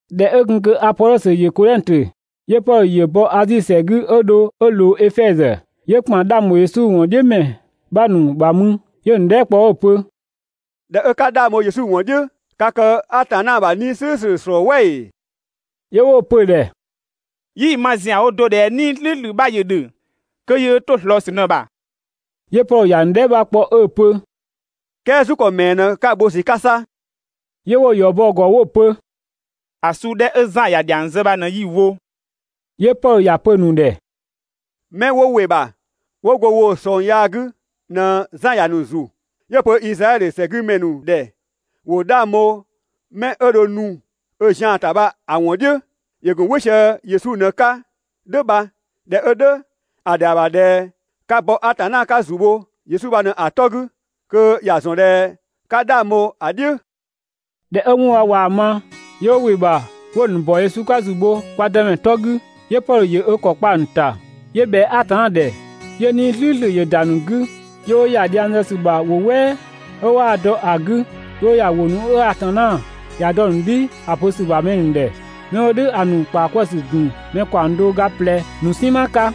꞊Dhɛ 'ö gun kö Apodhɔsö ‑yö Kodhɛngtö, 'yö Pɔdhö ‑yö bɔ Azi ‑sɛ 'gü 'ö dho 'ö ꞊loo Efɛzö, 'yö ‑kpan 'dhang ‑bho Yesu ‑wɔn "dhiʋ̈ ‑mɛ 'bha ‑nu ‑bha mü 'yö‑ ‑nu dhɛɛ" kpɔ 'ö‑ pö: «꞊Dhɛ 'ö 'ka 'dhang bho Yesu ‑wɔn "dhiʋ̈, ka kë Atanna ‑bha 'Nii‑ "slʋ̈ʋ̈slʋ̈ ‑slɔɔ "wɛ ‑ee?» 'Yö 'wo‑ pö‑ ‑dhɛ: «'Yii‑ ma ‑zianwo do ꞊dhɛ 'Nii‑ "slʋ̈ʋ̈slʋ̈ 'bha ‑yö ‑dhö (kö yöö 'to‑ ꞊slɔɔ ‑sü ꞊në‑ ‑bha). 'Yö Pɔdhö ‑ya ‑nu dhɛɛ" 'bha kpɔ 'ö‑ pö: «"Kɛɛ ‑go 'wɔn yaa 'gü ‑zu bho ‑kɔ suu ‑mɛɛ 'pö 'ka‑ wo ‑sü 'ka 'sa?» 'Yö 'wo‑ ‑yɔ bɔ‑ ‑gɔ 'wo‑ pö: «‑A suu 'dhɛ 'ö Zan ‑ya ‑dhiang zë bha ꞊në 'yi‑ wo.» 'Yö Pɔdhö ‑ya pö‑ ‑nu ‑dhɛ: «'Mɛ 'wo ‑wɩ ‑bha 'wo go woo‑ ꞊sɔng yaa 'gü ꞊në Zan ‑ya ‑nu ‑zu, 'yö‑ pö Izraɛdhö ‑sɛgümɛ ‑nu ‑dhɛ ‑wo 'dhang bho 'mɛ 'ö dho nu ö zian ‑ta bha‑ ‑wɔn "dhiʋ̈, ‑yö ‑gun "wɩ sië‑ Yesu ꞊në‑ 'ka "dhʋ̈ bha. (꞊Dhɛ 'ö "dhʋ̈, ‑a ‑dhɛa ‑bha ꞊dhɛ 'ka ‑bɔ Atanna 'ka ‑zü bho Yesu bha ꞊në‑ 'to 'gü kö ‑ya ‑zɔn ꞊dhɛ 'ka 'dhang bho‑ "dhiʋ̈.)» ꞊Dhɛ 'ö 'wɔn bha ꞊waa‑ ma, 'yö 'wo ‑wɩ ‑bha 'wo‑ ‑nu ‑bɔ Yesu 'ka ‑zu bho kwa Dëmɛ 'tɔ 'gü. 'Yö Pɔdhö ‑yö ö ‑kɔ kpa‑ ‑nu ‑ta ('yö ꞊bhɛa Atanna ‑dhɛ), 'yö 'Nii‑ "slʋ̈ʋ̈slʋ̈ ‑yö nu‑ ‑nu 'gü, 'yö 'wo ‑ya dhiang zë ‑sü ‑bha ‑wʋ "wɛɛ 'ö 'waa‑ dɔ ‑a 'gü, 'yö 'wo ‑ya ‑wʋ ‑nu 'ö Atanna ‑ya dɔ‑ ‑nu "dhi ‑a pö ‑sü ‑bha mɛ ‑nu ‑dhɛ. 'Mɛ 'wo "dhʋ̈ ‑a ‑nu ‑kpaa 'kwëë‑ ‑sü ‑gun mɛ ‑kaɔng do ö ga ꞊plɛ ‑nu "sinma 'ka.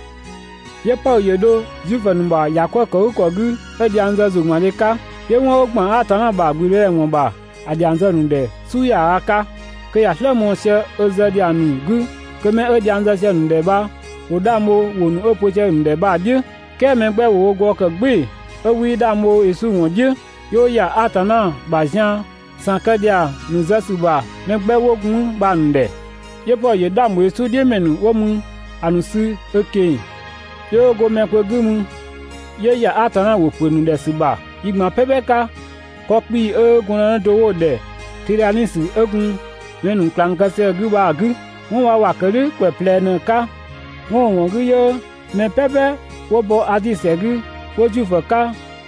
'Yö Pɔdhö ‑yö dho Zuifö ‑nu ‑bha ‑bhɔ "kwëë ‑kɔ 'gü 'ö dhiang zë ‑zʋgbandhe 'ka. 'Yö 'wɔn 'ö ‑gban Atanna ‑bha ‑gblüdëdhɛ ‑wɔn ‑bha ‑a ‑dhiang zë‑ ‑nu ‑dhɛ "su ‑yaaga 'ka, kö ‑ya "slë mɔɔ‑ sië ö zë ‑dhiang ‑nu 'gü kö mɛ 'ö dhiang zë sië‑ ‑nu ‑dhɛ bha ‑wo 'dhang bho ‑wʋ ‑nu 'ö‑ pö sië‑ ‑nu ‑dhɛ bha‑ "dhiʋ̈. "Kɛɛ mɛ 'gbɛ ‑wo wo gɔɔ‑ ‑kë "gbɩɩ‑ 'ö 'wii 'dhang bho Yesu ‑wɔn "dhiʋ̈, 'yö 'wo ‑ya Atanna ‑bha zian ‑san kë ‑dhiang ‑nu zë ‑sü ‑bha mɛ 'gbɛ 'wo gun 'mü bha‑ ‑nu ‑dhɛ. 'Yö Pɔdhö ‑yö 'dhang ‑bho Yesu "dhiʋ̈ ‑mɛ ‑nu 'wo gun 'mü ‑a ‑nu sü ö ꞊keng‑, 'yö 'wo go mɛ kpö 'gü mü 'yö ‑ya Atanna ‑wʋ pö‑ ‑nu ‑dhɛ ‑sü ‑bha yi ꞊gban "pɛpɛ 'ka 'kɔ 'kpii‑ 'ö gɔndënë do 'wo‑ ‑dhɛ Tidhanisö 'ö gun mɛ ‑nu ꞊klang kë sië‑ 'gü bha‑ 'gü. 'Wɔn bha ‑wa ‑kë "dhʋ̈ ‑kwɛ ꞊plɛ ꞊në‑ 'ka, 'wɔn 'ö‑ ‑wɔn 'gü 'yö mɛ "pɛpɛ 'wo bɔ Azi ‑sɛ 'gü, 'wo Zuifö 'ka,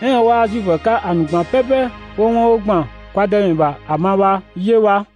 "ɛɛn 'ö 'waa Zuifö 'ka ‑a ‑nu ꞊gban "pɛpɛ 'wo 'wɔn 'ö ‑gban kwa Dëmɛ ‑bha ‑a ma bha 'yö bha.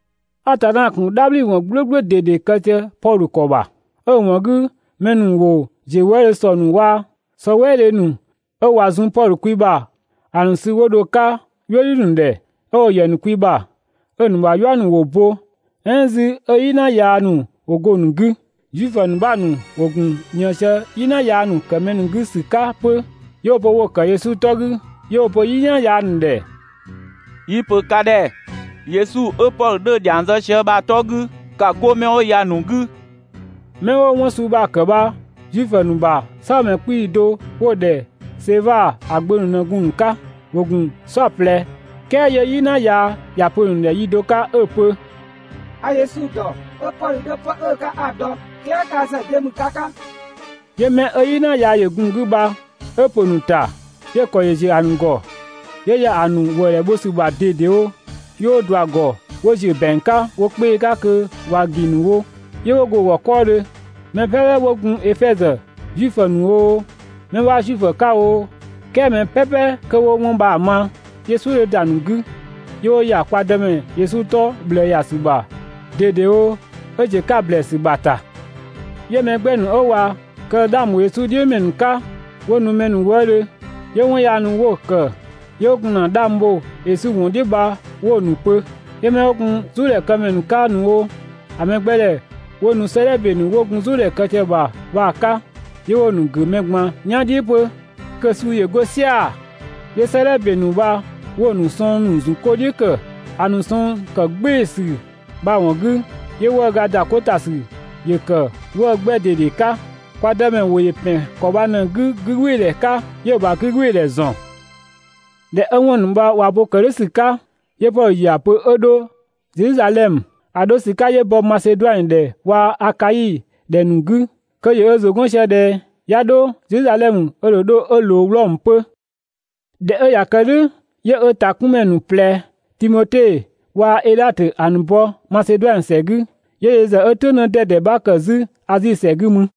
Atanna ‑gun "dhabhliwɔn "gblʋ̈gblʋ̈ ꞊dede ‑nu kë sië Pɔdhö ‑kɔ ‑bha, 'ö‑ ‑wɔn 'gü mɛ ‑nu ‑wo ‑ziö wëëdhö ‑sɔ ‑nu waa‑ sɔ "wɛɛdhe ‑nu 'ö ꞊wa zun Pɔdhö kwi ‑bha ‑a ‑nu sü 'wo dho‑ 'ka "yuëdhi ‑nu ‑dhɛ, 'ö 'wo‑ ‑yɛ wo kwi ‑bha, 'ö‑ ‑nu ‑bha "yua ‑yö bo "ɛɛn 'zü 'ö "yina yaa ‑nu 'wo go‑ ‑nu 'gü. Zuifö 'bha ‑nu ‑wo gun ꞊nië sië "yina yaa ‑nu ‑kë mɛ ‑nu 'gü ‑sü 'ka 'pö, 'yö 'wo‑ pö wo‑ ‑kë Yesu 'tɔ 'gü, 'yö 'wo‑ pö "yina yaa ‑nu ‑dhɛ: «Yi‑ ‑pö ka ‑dhɛ Yesu 'ö Pɔdhö 'dhö‑ ‑dhiang zë sië bha‑ 'tɔ 'gü, ‑ka 'go 'mɛ 'wo ya‑ ‑nu 'gü!» ('Mɛ 'wo 'wɔn suu bha‑ ‑kë bha Zuifö ‑nu ‑bha "saabhomɛ 'kpii‑ do 'wo‑ ‑dhɛ Seva ‑a gbö ‑nu ꞊në gun‑ ‑nu 'ka, ‑wo ‑gun "saɔplɛ.) "Kɛɛ 'yö "yina yaa ‑ya pö‑ ‑nu ‑dhɛ yi do 'ka 'ö‑ pö: «A Yesu ‑dɔ, 'ö Pɔdhö 'dhö 'pë 'ö‑ 'ka 'a‑ dɔ 'pö, "kɛɛ ka ‑zë de ‑mü ka 'ka?» 'Yö 'mɛ 'ö "yina yaa ‑yö gun‑ 'gü bha 'ö ‑pö ‑nu ‑ta, 'yö‑ ‑kɔ ‑yö ‑ziö ‑a ‑nu ‑gɔ 'yö ‑ya ‑a ‑nu ‑wëëdhɛ bho ‑sü ‑bha ꞊dedewo, 'yö 'wo ꞊dua‑ ‑gɔ 'wo ‑ziö ‑bɛang 'ka wo 'kpee‑ 'ka kö ꞊wa ‑gi ‑nu wo, 'yö 'wo go‑ ‑gɔ 'kɔɔdhö. Mɛ "pɛpɛ 'wo gun Efɛzö, Zuifö ‑nu oo, 'mɛ 'waa Zuifö 'ka oo, "kɛɛ mɛ "pɛpɛ 'kö 'wo 'wɔn bha‑ ma, 'yö "suʋ̈ 'dhö ‑da ‑nu 'gü, 'yö 'wo ‑ya kwa Dëmɛ Yesu 'tɔ ꞊bhlëë ‑ya ‑sü ‑bha ꞊dedewo 'ö ‑ziö 'ka ‑blɛɛsü ‑bha ‑ta. 'Yö mɛ 'gbɛ ‑nu 'ö ꞊wa kë 'dhang ‑bho Yesu ‑wɔn "dhiʋ̈ ‑mɛ ‑nu 'ka, 'wo nu mɛ ‑nu wëëdhö, 'yö 'wɔn yaa ‑nu 'wo‑ ‑kë 'yö 'wo gun ‑na 'dhang bho Yesu ‑wɔn "dhiʋ̈ bha 'wo‑ ‑nu pö. 'Yö 'mɛ 'wo gun "zʋʋdhɛ këmɛ ‑nu 'ka ‑nu wo, ‑a mɛgbɛdhɛ 'wo nu 'sëëdhɛ ‑be ‑nu 'wo gun "zʋʋdhɛ kë sië‑ ‑bha bha‑ 'ka, 'yö 'wo‑ ‑nu ‑gʋ̈ mɛ ꞊gban "yan "dhiʋ̈ 'pö kö‑ suu ‑yö 'go "sia‑. 'Yö 'sëëdhɛ ‑be ‑nu bha 'wo‑ ‑nu sɔng ‑zun ko "dhiʋ̈ ‑kë, ‑a ‑nu sɔng ‑kë "gbɩɩsü bha‑ ‑wɔn 'gü, 'yö‑ 'wëë‑ ‑da 'ko ‑ta ‑sü ‑yö ‑kë 'wëë‑ 'gbɛ ꞊dede 'ka. Kwa Dëmɛ ‑wʋ ‑yö ‑pɛn ‑kɔ bha ꞊në‑ 'gü 'gügbɩɩdhɛ 'ka, 'yö‑ ‑bha 'gügbɩɩdhɛ ‑zɔn. ꞊Dhɛ 'ö 'wɔn ‑nu bha ꞊wa bo ‑kë "dhʋ̈ ‑sü 'ka, 'yö Pɔdhö ‑ya pö 'ö 'dho Zedhizadhɛmö. ‑A 'dho ‑sü 'ka 'yö bɔ Maseduanö ‑dhɛ waa‑ Akai ‑dhɛ ‑nu 'gü, kö ‑yö ö ‑zʋ 'gɔn sië ꞊dhɛ 'ya 'dho Zedhizadhɛmö ö ‑dho dho 'ö ꞊loo Wlɔmö 'pö. ꞊Dhɛ 'ö ꞊ya kë "dhʋ̈, 'yö ö ‑takunmɛ ‑nu ꞊plɛ, Timote waa‑ Edhatö ‑a ‑nu bɔ Maseduanö ‑sɛ 'gü, 'yö yö ‑zë 'ö "tʋ̈ng 'dɛdɛ 'bha ‑kë 'zü Azi ‑sɛ 'gü mü.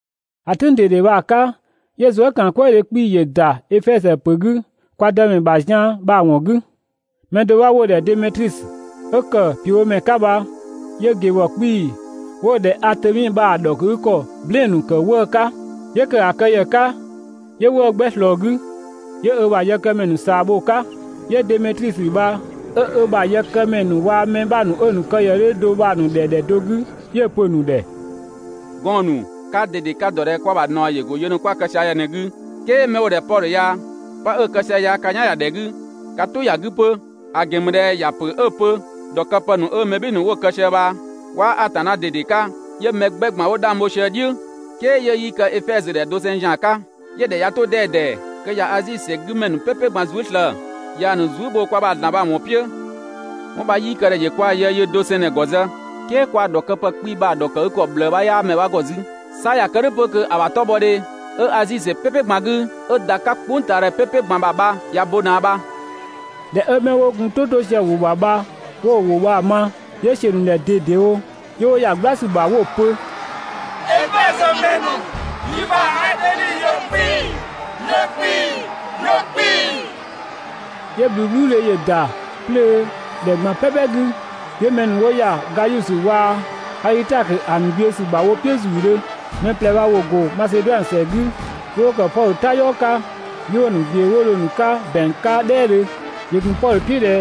‑A "tʋ̈ng ꞊dede bha‑ 'ka 'yö zuëkaankwëëdhe 'kpii‑ ‑yö ‑da Efɛzö ‑pö 'gü kwa Dëmɛ ‑bha zian bha‑ ‑wɔn 'gü. Mɛ do 'bha 'wo‑ ‑dhɛ Demetrisö, 'ö ‑kë ‑piöbhomɛ 'ka bha 'yö ꞊gebhɔ 'kpii‑ 'wo‑ ‑dhɛ Atemi bha‑ ‑dhɔkëgükɔ "blɛɛn‑ ‑nu ‑kë 'wëë‑ 'ka. 'Yö ‑kë ‑a kë ‑yë 'ka, 'yö 'wëë‑ 'gbɛ ꞊slɔɔ‑ 'gü, 'yö ö ‑bha yëkëmɛ ‑nu ꞊saa‑ bho‑ 'ka. 'Yö Demetrisö bha 'ö ö ‑bha yëkëmɛ ‑nu waa‑ mɛ 'bha ‑nu 'ö‑ ‑nu kë ‑yë 'dhö do bha‑ ‑nu ‑dhɛ ‑dhɛ do 'gü 'yö‑ pö‑ ‑nu ‑dhɛ: «Gɔɔn‑ ‑nu, kaa ꞊dede ka‑ ‑dɔ ꞊dhɛ kwa ‑bha ꞊naɔ ‑yö ‑go yë ‑nu 'kwa‑ kë sië ya ꞊në‑ 'gü, "kɛɛ 'mɛ 'wo‑ ‑dhɛ Pɔdhö ya, 'pë 'ö‑ kë sië ya ka "yan ‑ya ‑dhɛ 'gü, ka "tʋ ‑ya 'gü 'pö. ‑A ‑gɛn ‑mü ꞊dhɛ ‑ya ‑pö 'ö‑ pö ‑dhɔkëpë ‑nu 'ö mɛ "bhɩɩ‑ ‑nu 'wo‑ kë sië bha 'waa Atanna ꞊dede 'ka, 'yö mɛ 'gbɛ ꞊gban 'wo 'dhang bho sië‑ "dhiʋ̈, "kɛɛ 'yö 'yii kë Efɛzö ‑dhɛ doseng ‑zian 'ka, 'yö‑ ‑dhɛ ꞊ya 'to 'dɛdɛ kö ꞊ya Azi ‑sɛ ya‑ 'gü ‑mɛ ‑nu "pɛpɛ ꞊gban zuë" slëë‑ ꞊yaa‑ ‑nu zuë" bho kwa ‑bha ‑zlan bha‑ ‑wɔn "piʋ̈. 'Wɔn bha 'yii kë ꞊dhɛ ‑yö kwa ‑bha yë yöö do ꞊në‑ ‑gɔ zë, "kɛɛ kwa ‑bha ‑dhɔkëpë 'kpii‑ bha‑ ‑dhɔkëgükɔ ꞊bhlëë 'bha 'yaa mɛ 'bha ‑gɔ 'zü, 'sa ꞊ya kë "dhʋ̈ 'pö kö ‑a ‑bha 'tɔbhɔdhe 'ö Azi ‑sɛ "pɛpɛ ꞊gban 'gü 'ö ‑da 'ka "kpʋngtaadhɛ "pɛpɛ ꞊gban ‑bha bha ꞊ya bo ꞊naa bha.» ꞊Dhɛ 'ö 'mɛ 'wo gun "tʋ 'to sië‑ ‑wʋ ‑bha bha 'wo ‑wʋ bha‑ ma, 'yö ‑siö ‑nu ‑dhɛ ꞊dedewo 'yö 'wo ‑ya "gbla ‑sü ‑bha 'wo pö: «Efɛzö ‑mɛ ‑nu, yi ‑bha Atemi ‑yö 'kpii‑, ‑yö 'kpii‑, ‑yö 'kpii‑!» 'Yö ꞊bhluubhluudhe ‑yö ‑da 'plöö ‑dhɛ ꞊gban "pɛpɛ 'gü. 'Yö mɛ ‑nu 'wo ‑ya Gayusö waa‑ Adhitakö ‑a ‑nu ꞊gbiʋ̈ ‑sü ‑bha wo "piʋ̈ ‑zuudhö. Mɛ ꞊plɛ bha ‑wo ‑go Maseduanö ‑sɛ 'gü 'yö 'wo ‑kë Pɔdhö "tayɔɔ 'ka. 'Yö 'wo‑ ‑nu ꞊gbiʋ̈ 'wo dho‑ ‑nu 'ka ‑bɛang 'ka "dhɛɛdhö. ‑Yö ‑gun Pɔdhö "piʋ̈ 'nu ꞊dhɛ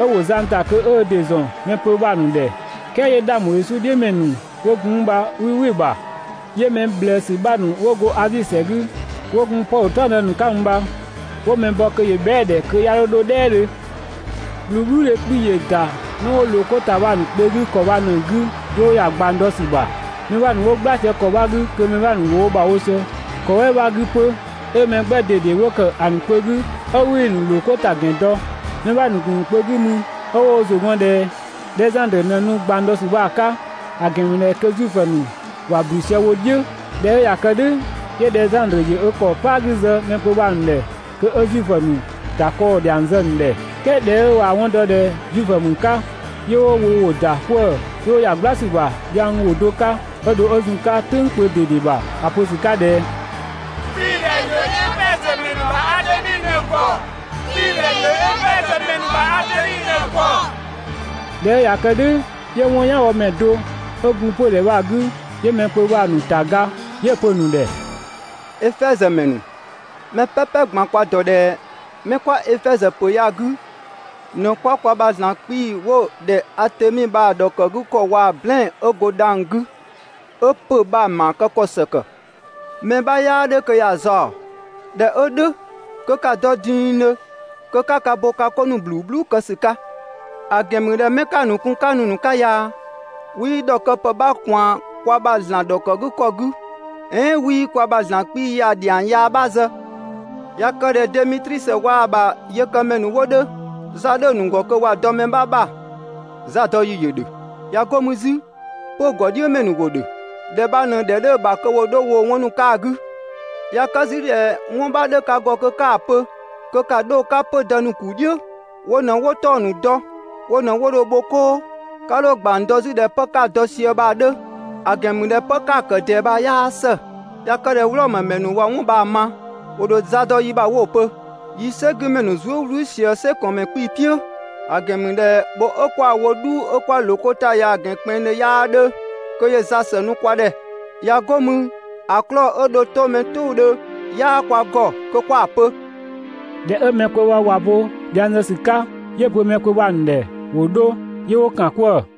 'ö ‑wo zang ‑ta kö 'ö ö ‑dɩ ‑zɔn mɛ kpö bha‑ ‑nu ‑dhɛ, "kɛɛ 'yö 'dhang bho Yesu "dhiʋ̈ ‑mɛ ‑nu 'wo gun mü bha 'wii "wɩ‑ ‑bha. 'Yö mɛ ꞊bhlëësü 'bha ‑nu 'wo go Azi ‑sɛ 'gü 'wo gun Pɔdhö "taɔngdë ‑nu 'ka 'mü bha 'wo mɛ bɔ kö ‑yö bhɛa"‑ ‑dhɛ kö 'ya 'dho 'dho "dhɛɛdhö. Zuëkaankwëëdhe 'kpii‑ ‑yö ‑da 'mɛ 'wo ꞊loo 'ko ‑ta bha‑ ‑nu kpö 'gü ‑kɔ bha ꞊në‑ 'gü 'yö 'wo ‑ya ꞊gbang dɔ ‑sü ‑bha. Mɛ 'bha ‑nu 'wo "gbla sië ‑kɔ 'bha 'gü kö mɛ 'bha ‑nu ‑wo wo ‑bha wo sië ‑kɔ "wɛɛ bha‑ 'gü 'pö. 'Ö mɛ 'gbɛ ꞊dede 'wo ‑kë ‑a ‑nu kpö 'gü 'ö 'wii‑ ‑nu ‑loo 'ko ‑ta ‑gɛn dɔ. (Mɛ 'bha ‑nu ‑gun ‑nu kpö 'gü mü 'ö 'wo wo ‑zʋ ‑gɔn ꞊dhɛ Dhɛzandrö ꞊në nu ꞊gbang dɔ ‑sü bha‑ 'ka,) ‑a ‑gɛn ‑mü ꞊dhɛ kö Zuifö ‑nu ‑wa ‑blü sië wo "dhiʋ̈. ꞊Dhɛ 'ö ꞊ya kë "dhʋ̈, 'yö Dhɛzandrö ‑yö ö ‑kɔ "paa 'gü zë mɛ kpö bha‑ ‑nu ‑dhɛ kö 'ö Zuifö ‑nu ‑ta 'kɔɔ‑ ‑dhiang zë‑ ‑nu ‑dhɛ. "Kɛɛ ꞊dhɛ 'ö waa‑ 'wɔn dɔ ꞊dhɛ Zuifö ‑mü 'ka, 'yö 'wo wo ‑wʋ ‑da 'kwëë‑ 'wo ‑ya "gbla ‑sü ‑bha dhiang ‑wʋ do 'ka, 'ö dho 'ö zun‑ 'ka "tʋ̈ng kpö ꞊dede ‑bha ‑a pö ‑sü 'ka ꞊dhɛ: «'Kpiidhɛ ‑yö Efɛzö ‑mɛ ‑nu ‑bha Atemi ꞊në‑ ‑gɔ! 'Kpiidhɛ ‑yö Efɛzö ‑mɛ ‑nu ‑bha Atemi ꞊në‑ ‑gɔ!» ꞊Dhɛ 'ö ꞊ya kë "dhʋ̈ 'yö 'wɔn "yanbhɔmɛ do 'ö gun 'pödhɛ bha‑ 'gü, 'yö mɛ kpö bha‑ ‑nu ‑ta ga, 'yö‑ pö‑ ‑nu ‑dhɛ: «Efɛzö ‑mɛ ‑nu, mɛ "pɛpɛ ꞊gban kwa‑ ‑dɔ ꞊dhɛ 'mɛ 'kwa Efɛzö ‑pö ya‑ 'gü ꞊në 'kwa kwa ‑bha ‑zlan 'kpii‑ 'wo‑ ‑dhɛ Atemi bha‑ ‑dhɔkëgükɔ waa‑ "blɛɛn‑ 'ö go dhang‑ 'gü 'ö ‑pö bha‑ ‑maa kë ‑kɔ ‑së ‑kë. Mɛ 'bha 'yaa ‑dhö kö ‑ya zaɔ‑. ꞊Dhɛ 'ö "dhʋ̈ kö ‑ka dɔ dingdhö kö 'ka ‑ka bo ka 'ko ‑nu ꞊bhluu "bhluu kë ‑sü 'ka! ‑A ‑gɛn ‑mü ꞊dhɛ 'mɛ 'ka‑ ‑nu kun 'ka nu‑ ‑nu 'ka ya, 'wii ‑dhɔkëpë 'bha ꞊kwaan kwa ‑bha ‑zlan ‑dhɔkëgükɔ 'gü "ɛɛn 'wii kwa ‑bha ‑zlan 'kpii‑ ya‑ ‑dhiang yaa 'bha zë. ꞊Ya kë ꞊dhɛ Demetrisö waa‑ ‑bha yëkëmɛ ‑nu 'wo 'dhö, za 'dhö‑ ‑nu ‑gɔ kö ‑wa dɔ mɛ 'bha ‑bha, zadɔyi ‑yö ‑dhö. ꞊Ya 'go mü 'zü, 'pö‑ ‑gɔdhiʋ̈mɛ ‑nu ‑wo ‑dhö. ‑Dhɛ bha ꞊në‑ ‑dhɛ 'dhö‑ ‑bha kö ‑wo 'dho woo‑ 'wɔn ‑nu 'ka‑ 'gü! ꞊Ya kë 'zü ꞊dhɛ 'wɔn 'bha 'dhö‑ ka ‑gɔ kö 'ka‑ pö kö ‑ka 'dho‑ 'ka 'pödë ‑nu ‑kuu "dhiʋ̈, wo ꞊në 'wo 'tɔng‑ ‑nu dɔ, wo ꞊në 'wo dho‑ bho 'koo, 'ka 'dho ꞊gbang dɔ 'zü ꞊dhɛ 'pë 'ka‑ dɔ sië bha‑ 'dhö, ‑a ‑gɛn ‑mü ꞊dhɛ 'pë 'ka‑ ‑kë ꞊dɛɛ bha 'yaa ‑së. ꞊Ya kë ꞊dhɛ Wlɔmö ‑mɛ ‑nu ꞊wa 'wɔn bha‑ ma, ‑wo ‑dho za dɔ yi ‑bha 'wo‑ pö: «Yi "sɛgümɛ ‑nu zuë" "wlü sië "sɛkɔɔnmɛ 'kpii‑ "piʋ̈!» ‑A ‑gɛn ‑mü ꞊dhɛ bho 'ö 'kwa‑ wo "dhuu 'ö kwa ꞊loo 'ko ‑ta ya‑ ‑gɛn kpɛnngdhö 'yaa 'dhö kö ‑yö za ‑së nu kwa ‑dhɛ. ꞊Ya 'go mü ‑a 'klɔɔ‑ 'ö dho 'to mɛ "tʋʋdhö 'yaa kwa ‑gɔ kö 'kwa‑ pö.» ꞊Dhɛ 'ö 'mɛ bha ꞊ya bo dhiang bha‑ zë ‑sü 'ka, 'yö‑ pö mɛ kpö bha‑ ‑nu ‑dhɛ ‑wo 'dho, 'yö 'wo ‑kan 'kwëë‑.